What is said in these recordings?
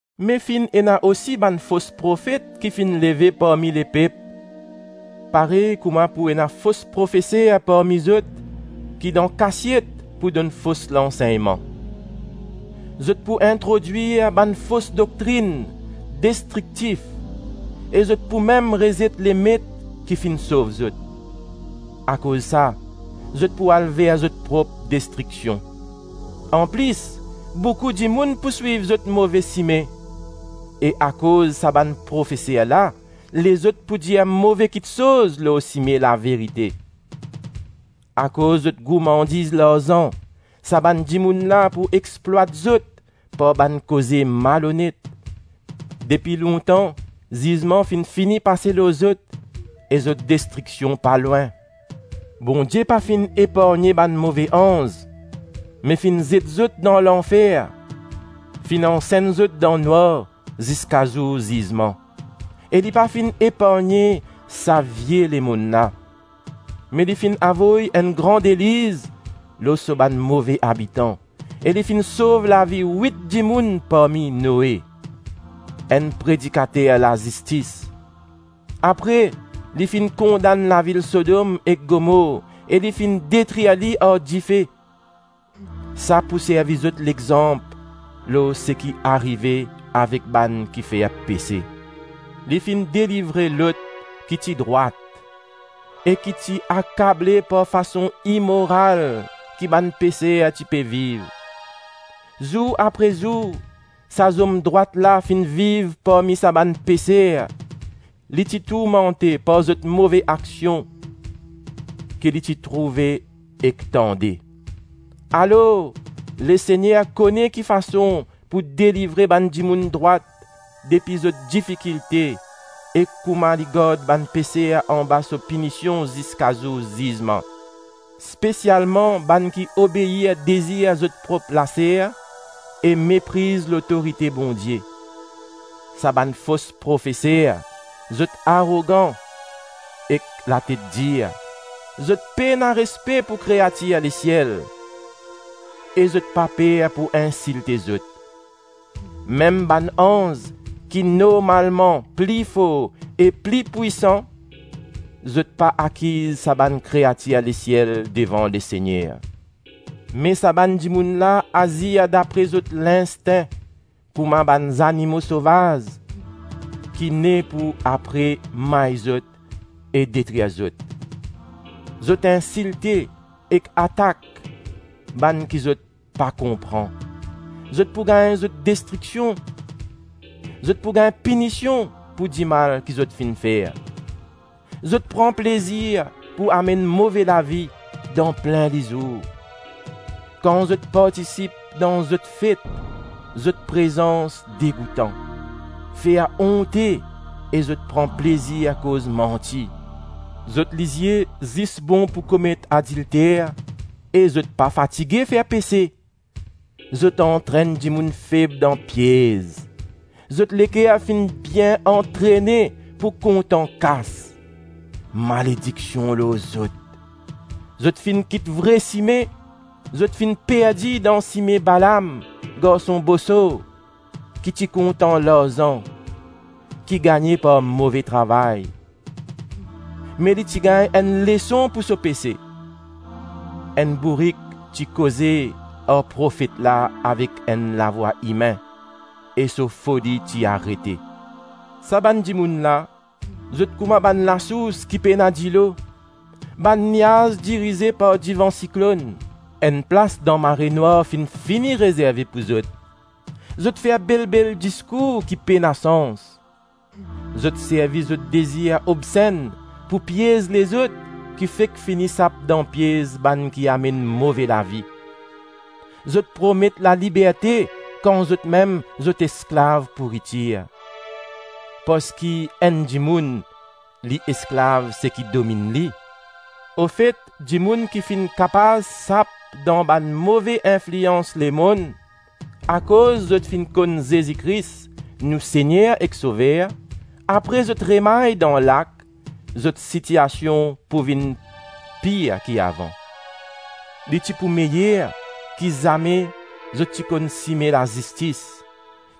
Me finn ena osi bann fos profet ki finn leve parmi lepep, parey kouma pou ena fos profeser parmi zot ki, dan kasiet pou donn fos lansegnman. Zot pou introdwir bann fos doktrinn destriktif e zot pou mem rezet Lemet ki finn sov zot. Akoz sa, zot pou al ver zot prop destriksion. Anplis, boukou dimoun pou swiv zot move sime, e akoz sa bann profeser la, lezot pou dir move kitsoz lor sime laverite. Akoz zot gourmandiz larzan, sa bann dimoun la pou explwat zot par bann koze malonet. Depi lontan, zizman finn fini pase lor zot e zot destriksion pa lwin. Bondie pa finn epargne bann move anz, me finn zet zot dan lanfer, finn ansenn zot dan nwar ziska zour zizman; e li pa finn epargne sa vie lemonn la, me li finn avoy enn gran deliz lor so bann move abitan, e li finn sov lavi wit dimoun parmi Noe, enn predikater lazistis. Apre li finn kondann lavil Sodom ek Gomor e li finn detrir li ar dife. Sa pou servi zot lexanp lor seki arive avek bann ki fer pese. Li finn delivre Lot ki ti drwat, e ki ti akable par fason imoral ki bann peser ti pe viv. Zour apre zour sa zom drwat la finn viv parmi sa bann peser; li ti tourmante par zot move aksion ki li ti trouve ek tande, alor Lesegner kone ki fason pou delivre bann dimoun drwat depi zot difikilte e kouma li gard bann peser anba so pinision ziska zour zizman; spesialman bann ki obeir dezir zot prop laser e mepriz lotorite Bondie. Sa bann fos profeser, zot arogan ek latet dir, zot pena respe pou kreatir lesiel e zot pa per pou insilte zot. Mem bann anz ki normalman pli for e pli pwisan, zot pa akiz sa bann kreatir lesiel devan Lesegner. Me sa bann dimoun la azir dapre zot linstin kouma bann zanimo sovaz ki ne pou apre may zot e detrir zot; zot insilte ek atak bann ki zot pa konpran, zot pou gagn zot destriksion. Zot pou gagn pinision pou dimal ki zot finn fer. Zot pran plezir pou amenn move lavi dan plin lizour. Kan zot partisip dan zot fet, zot prezans degoutan, fer onte e zot pran plezir koz manti. Zot lizie zis bon pou komet adilter e zot pa fatige fer pese. Zot antrenn dimoun feb dan piez. Zot leker finn bien antrene pou kontan kas. Malediksion lor zot. Zot finn kit vre sime, zot finn perdi dan sime Balam, garson Bosor ki ti kontan larzan ki gagne par move travay, me li ti gagn enn leson pou so pese. Enn bourik ti koze ar profet la avek enn lavwa imin e so foli ti arete. Sa bann dimoun la, zot kouma bann lasours ki pena dilo, bann niaz dirize par devan siklonn. Enn plas dan marenwar finn fini rezerve pou zot. Zot fer bel-bel diskour ki pena sans; zot servi zot dezir obsenn pou piez lezot ki fek fini sap dan piez bann ki amenn move lavi. Zot promet laliberte, kan zotmem zot esklav pouritir; parski enn dimoun li esklav seki dominn li. Ofet dimoun ki finn kapav sap dan bann move inflians lemonn akoz zot finn konn Zezi Kris, nou Segner ek Sover, apre zot remay dan lak, zot sitiasion pou vinn pir ki avan. Li ti pou meyer ki zame zot ti konn sime lazistis,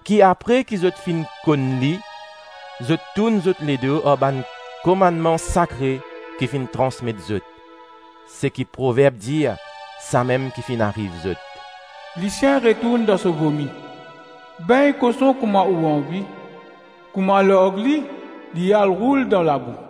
ki apre ki zot finn konn li, zot tourn zot ledo ar bann komannman sakre ki finn transmet zot. Seki proverb dir, samem ki finn ariv zot: “Lisien retourn dan so vomi,” “Begn koson kouma ou anvi. Kouma larg li, li al roul dan labou.”